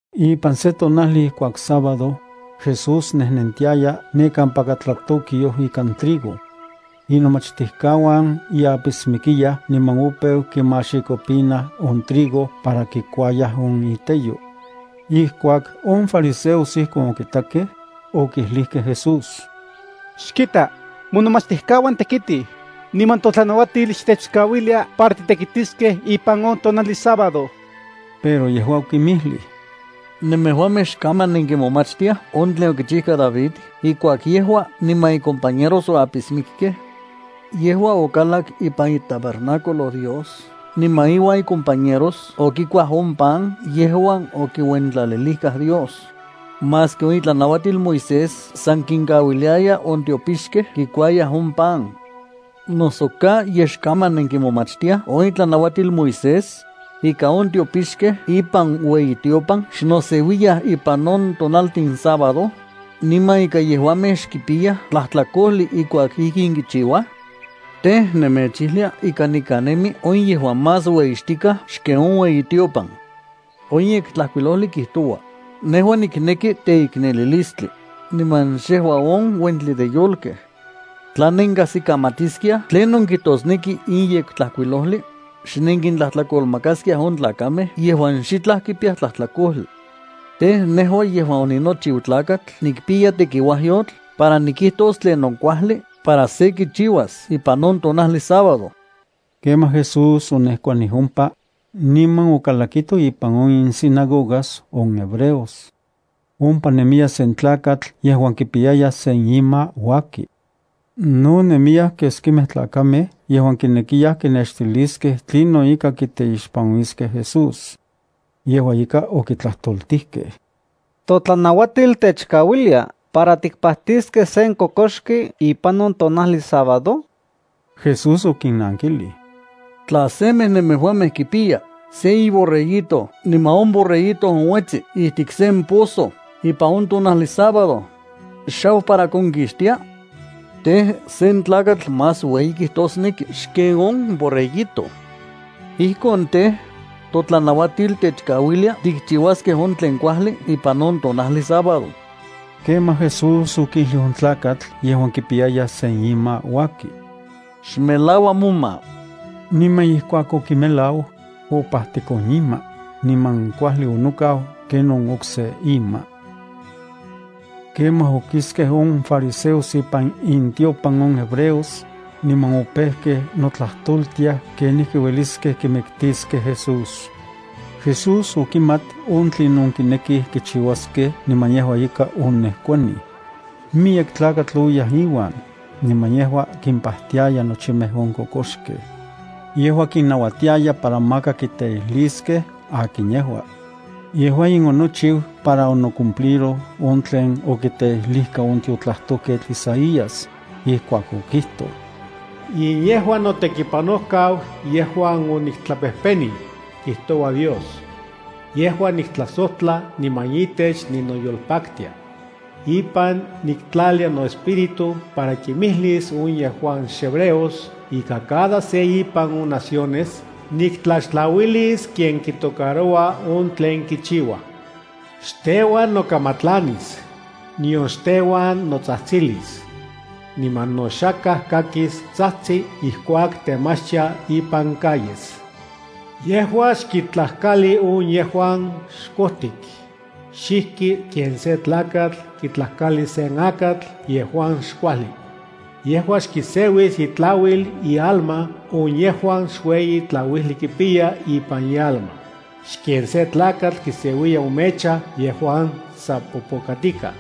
Ipan se tonajli ijkuak sábado, Jesús nejnentiaya ne kampaka tlatokyoj ikan trigo. Inomachtijkauan ye apismikiyaj niman opeu kimaxikopinaj on trigo para kikuayaj on iteyo. Ijkuak on fariseos ijkon okitakej, okijlijkej Jesús: —Xkita, monomachtijkauan tekitij, niman totlanauatil xtechkauilia para titekitiskej ipan on tonajli sábado. Pero yejua okinmijlij: —¿Nemejuamej xkaman nenkimomachtiaj on tlen okichijka David ijkuak yejua niman icompañeros oapismikkej? Yejua okalak ipan itabernáculo Dios niman iuan icompañeros okikuaj on pan yejuan okiuentlalilijkaj Dios, maski on itlanauatil Moisés san kinkauiliaya on tiopixkej kikuayaj on pan. ¿Noso ka yej xkaman nenkimomachtiaj on itlanauatil Moisés, ika on tiopixkej ipan ueyitiopan xnoseuiyaj ipan on tonaltin sábado, niman ika yejuamej xkipiyaj tlajtlakojli ijkuak ijkin kichiuaj? Tej, nemechijlia ika nikan nemi on yejuan más ueyixtikaj xken on ueyitiopan. On Yektlajkuilojli kijtoua: “Nejua nikneki teiknelilistli, niman xejua on uentli de yolkej.” Tla nenkajsikamatiskiaj tlinon kijtosneki in Yektlajkuilojli, xnenkintlajtlakolmakaskiaj on tlakamej yejuan xitlaj kipiyaj tlajtlakojli. Tej, nejua yejuan oninochiu Tlakatl nikpiya tekiuayotl para nikijtos tlinon kuajli para se kichiuas ipan on tonajli sábado. Kemaj Jesús onejkuanij ompa, niman okalakito ipan on insinagogas on hebreos. Ompa nemiya sen tlakatl yejuan kipiyaya se ima uaki. No nemiyaj keskimej tlakamej yejuan kinekiyaj kinextiliskej tlinon ika kiteixpanuiskej Jesús. Yejua ika okitlajtoltijkej: —¿Totlanauatil techkauilia para tikpajtiskej sen kokoxki ipan on tonajli sábado? Jesús okinnankilij: —¿Tla semej nemejuamej kipiya sen iborreguito niman on borreguito onuetsi ijtik sen pozo ipan on tonajli sábado, xau para konkixtia? Tej, sen tlakatl más ueyi kijtosneki xken on borreguito. Ijkon, tej, totlanautil techkauilia tikchiuaskej on tlen kuajli ipan on tonajli sábado. Kemaj, Jesús okijlij on tlakatl yejuan kipiyaya sen ima uaki: —Xmelaua moma. Niman ijkuak okimelau, opajtik on ima, niman kuajli onokau ken on okse ima. Kemaj okiskej on fariseos ipan intiopan on hebreos, niman opejkej notlajtoltiaj kenijki ueliskej kimiktiskej Jesús. Jesús okimat on tlinon kinekij kichiuaskej niman yejua ika onejkuanij. Miyek tlakatl oyaj iuan, niman yejua kimpajtiaya nochimej on kokoxkej. Yejua kinnauatiaya para maka kiteijliskej akin yejua. Yejua in onochiu para onocumpliroj on tlen okiteijlijka on tiotlajtojketl Isaías, ijkuak okijtoj: “In yejua notekipanojkau yejuan oniktlapejpenij”, kijtoua Dios. “Yejua niktlajsojtla niman itech ninoyolpaktia. Ipan niktlalia noEspíritu para kimijlis on yejuan xhebreos ika cada se ipan on naciones niktlaxtlauilis ken kitocaroua on tlen kichiua. Xteuan nokamatlanis, nion xteuan notsajtsilis. Niman no xakaj kakis sa tsajtsi ijkuak temachtia ipan calles. Yejua xkitlajkali on yejuan xkojtik, xijki ken sen tlakatl kitlajkali sen akatl yejuan xkuajli. Yejua xkiseuis itlauil ialma on yejuan xueyi tlauijli kipiya ipan ialma, xken sen tlakatl kiseuiya on mecha yejuan sa popokatikaj.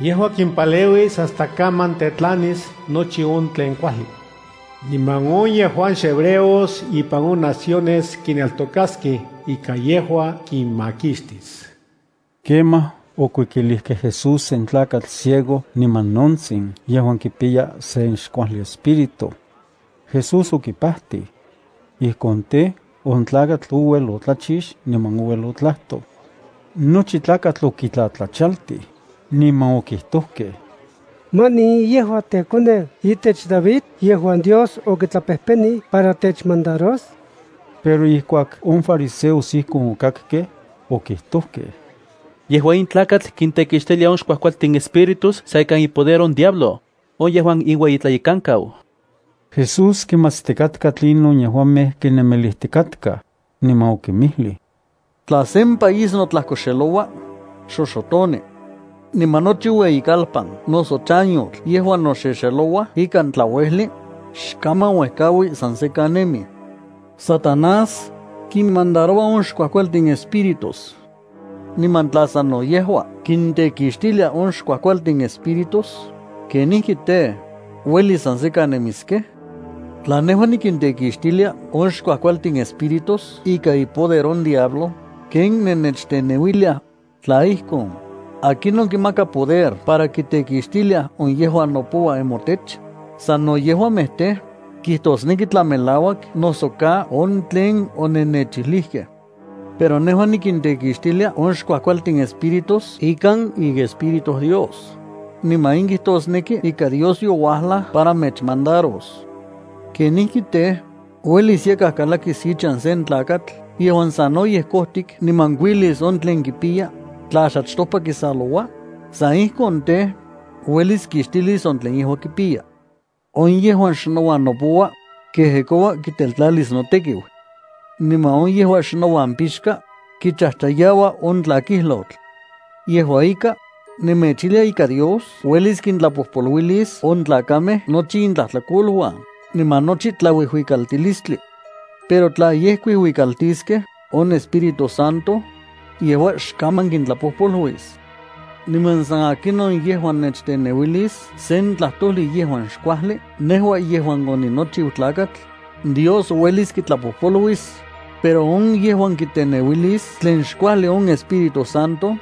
Yejua kimpaleuis hasta kaman tetlanis nochi on tlen kuajli. Niman on yejuan xhebreos ipan on naciones kineltokaskej ika yejua kinmakixtis.” Kemaj okuikilijkej Jesús sen tlakatl ciego niman nontsin yejuan kipiya sen xkuajli espíritu. Jesús okipajtij. Ijkon, tej, on tlakatl ouel otlachix niman ouel otlajtoj. Nochi tlakatl okitlatlachaltij, niman okijtojkej: —¿Manin in yejua teuejkakoneu itech David yejuan Dios okitlapejpenij para techmandaros? Pero ijkuak on fariseos ijkon okakkej, okijtojkej: —Yejua in tlakatl kintekixtilia on xkuajkualtin espíritus san ikan ipoder on diablo, on yejuan inueyitlayekankau. Jesús kimatstikatka tlinon yejuamej kinemilijtikatkaj, niman okinmijlij: —Tla sen país notlajkoxeloua, xoxotoni. Niman nochi ueyikalpan noso chanyotl yejuan noxexelouaj ikan tlauejli, xkaman uejkaui san sekan nemij. Satanás kinmandaroua on xkuajkualtin espíritus. Niman tla sano yejua kintekixtilia on xkuajkualtin espíritus, ¿kenijki tej, uelis san sekan nemiskej? Tla nejua niktekixtilia on xkuajkualtin espíritus ikan ipoder on diablo ken nennechteneuiliaj, tla ijkon, ¿akinon kinmaka poder para kitekixtiliaj on yejuan nopouaj nemotech? Sano yejuamej tej, kijtoskej tla melauak noso ka on tlen onennechijlijkej. Pero nejua nikintekixtilia on xkuajkualtin espíritus ikan iEspíritu Dios, niman in kijtosneki ika Dios youajlaj para mechmandaros. ’¿Kenijki tej, uelis yakaj kalakis ichan se tlakatl yejuan sanoyej kojtik niman kuilis on tlen kipiya, tla xachtopa kisaloua? San ijkon tej, uelis kixtilis on tlen yejua kipiya. ’On yejuan xnouan nopoua, kejekoua kiteltlalis notekiu. Niman on yejuan xnouan pixka, kichajchayaua on tlakilyotl. Yejua ika, nemechijlia ika Dios uelis kintlapojpoluilis on tlakamej nochi intlajtlakoluan niman nochi tlauijuikaltilistli. Pero tla yej kuijuikaltiskej on Espíritu Santo, yejua xkaman kintlapojpoluis. Niman san akinon yejuan nechteneuilis se tlajtojli yejuan xkuajli nejua yejuan oninochiu Tlakatl, Dios uelis kitlapojpoluilis, pero on yejuan kiteneuilis tlen xkuajli on Espíritu Santo,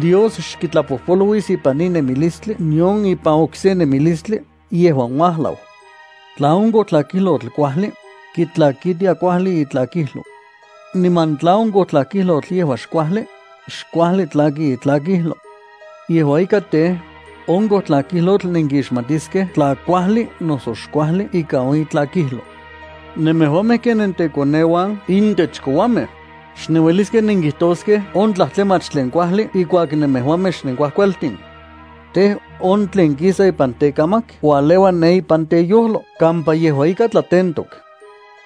Dios xkitlapojpoluis ipan in nemilistli nion ipan okse nemilistli yejuan uajlau. ’Tla on kojtlakijlotl yejua kuajli, kitlakitia kuajli itlakijlo. Niman tla on kojtlakijlotl yejua xkuajli, xkuajli tlaki itlakijlo. Yejua ika tej, on kojtlakijlotl nenkixmatiskej tla kuajli noso xkuajli ika on itlakijlo. ¡Nemejuamej ken tekoneuan intech kouamej! Xnenueliskej nenkijtoskej on tlajtlamach tlen kuajli ijkuak nemejuamej xnenkuajkualtin. Tej, on tlen kisa ipan tekamak ualeua ne ipan teyojlo kampa yejua ika tlatentok.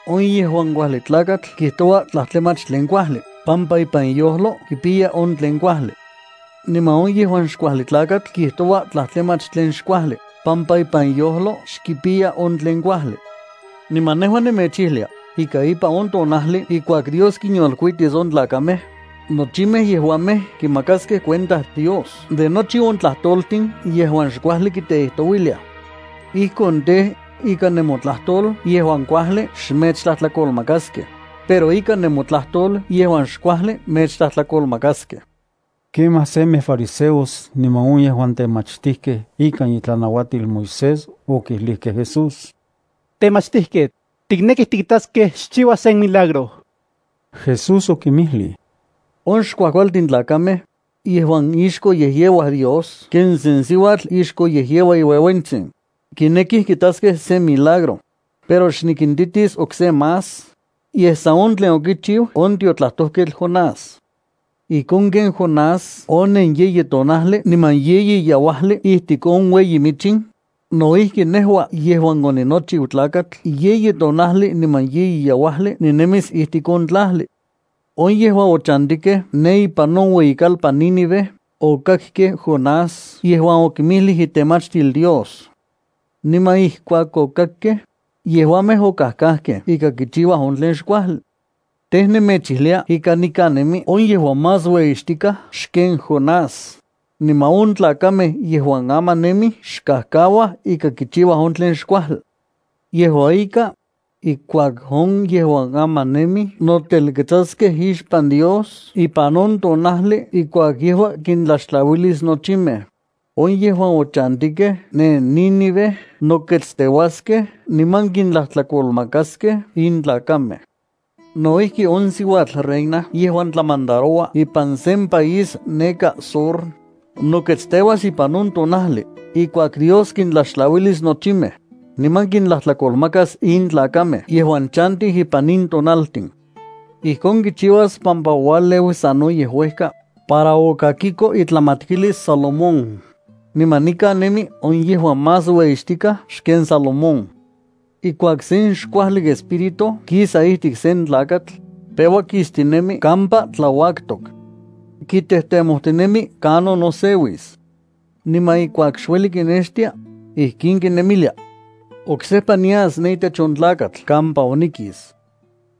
On yejuan kuajli tlakatl kijtoua tlajtlamach tlen kuajli pampa ipan iyojlo kipiya on tlen kuajli. Niman on yejuan xkuajli tlakatl kijtoua tlajtlamach tlen xkuajli pampa ipan iyojlo xkipiya on tlen kuajli. Niman nejua nemechijlia ika ipan on tonajli ijkuak Dios kinyolkuitis on tlakamej, nochimej yejuamej kimakaskej cuenta Dios de nochi on tlajtoltin yejuan xkuajli kiteijtouiliaj. Ijkon tej, ikan nemotlajtol yejuan kuajli xmechtlajtlakolmakaskej, pero ikan nemotlajtol yejuan xkuajli mechtlajtlakolmakaskej. Kemaj semej fariseos niman on yejuan temachtijkej ikan itlanauatil Moisés okijlijkej Jesús: —Temachtijketl, tiknekij tikitaskej xchiua sen milagro. Jesús okinmijlij: —On xkuajkualtin tlakamej, yejuan ixkoyejyeuaj Dios ken sen siuatl ixkoyejyeua iueuentsin, kinekij kitaskej sen milagro. Pero xnikintitis okse más, yej san on tlen okichiu on tiotlajtojketl Jonás. Ijkon ken Jonás onen yeyi tonajli niman yeyi yeuajli ijtik on ueyi michin, no ijki nejua yejuan oninochiu Tlakatl yeyi tonajli niman yeyi yeuajli ninemis ijtik on tlajli. On yejuan ochantijkej ne ipan on ueyikalpan Nínive okakkej Jonás yejuan okinmijlij itemachtil Dios. Niman ijkuak okakkej, yejuamej okajkajkej ika kichiuaj on tlen xkuajli. Tej, nemechijlia ika nikan nemi on yejuan más ueyixtikaj xken Jonás, niman on tlakamej yejuan aman nemij xkajkauaj ika kichiuaj on tlen xkuajli. Yejua ika, ijkuak on yejuan aman nemij notelketsaskej ixpan Dios ipan on tonajli ijkuak yejua kintlaxtlauilis nochimej, on yejuan ochantikej ne Nínive noketsteuaskej niman kintlajtlakolmakaskej in tlakamej. No ijki, on siuatl reina yejuan tlamandaroua ipan sen país neka Sur, noketsteuas ipan on tonajli ijkuak Dios kintlaxtlauilis nochimej, niman kintlajtlakolmakas in tlakamej yejuan chantij ipan in tonaltin. Ijkon kichiuas pampa ouajleu sanoyej uejka para okakiko itlamatkilis Salomón, niman nikan nemi on yejuan más ueyixtikaj xken Salomón. ’Ijkuak sen xkuajli espíritu kisa ijtik sen tlakatl, peua kistinemi kampa tlauaktok. Kitejtemojtinemi kanon noseuis. Niman ijkuak xueli kinextia, ijkin kinemilia: ‘Oksejpa nias ne itech on tlakatl kampa onikis.”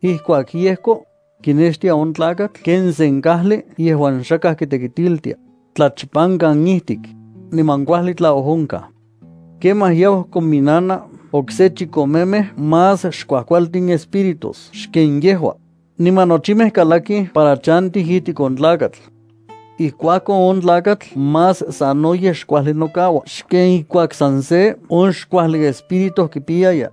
Ijkuak yejko, kinextia on tlakatl ken sen kajli yejuan xakaj kitekitiltia, tlachpankan ijtik, niman kuajli tlaojonkaj. Kemaj yau kominana okse chikomemej más xkuajkualtin espíritus xken yejua, niman nochimej kalakij para chantij ijtik on tlakatl. Ijkuakon on tlakatl más sanoyej xkuajli nokaua xken ijkuak san se on xkuajli espíritu kipiyaya.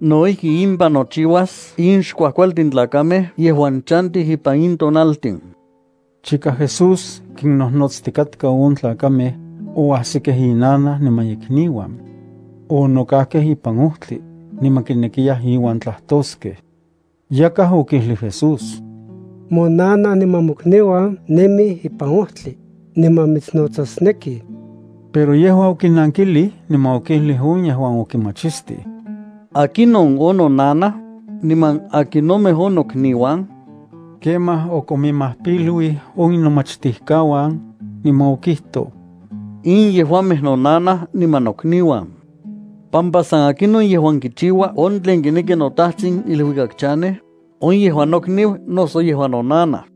No ijki impan nochiuas in xkuajkualtin tlakamej yejuan chantij ipan in tonaltin. Chika Jesús kinnojnotstikatka on tlakamej, oajsikej inanaj niman ikniuan. Onokajkej ipan ojtli, niman kinekiyaj iuan tlajtoskej. Yakaj okijlij Jesús: —Monanaj niman mokniuan nemij ipan ojtli, niman mitsnotsasnekij. Pero yejua okinankilij niman okijlij on yejuan okimachistij: —¿Akinon on nonanaj, niman akinomej on nokniuan? Kemaj okominmajpiluij on inomachtijkauan, niman okijtoj: —In yejuamej nonanaj niman nokniuan, pampa san akinon yejuan kichiua on tlen kineki noTatsin iluikak chanej, on yejua nokniu noso yejua nonanaj.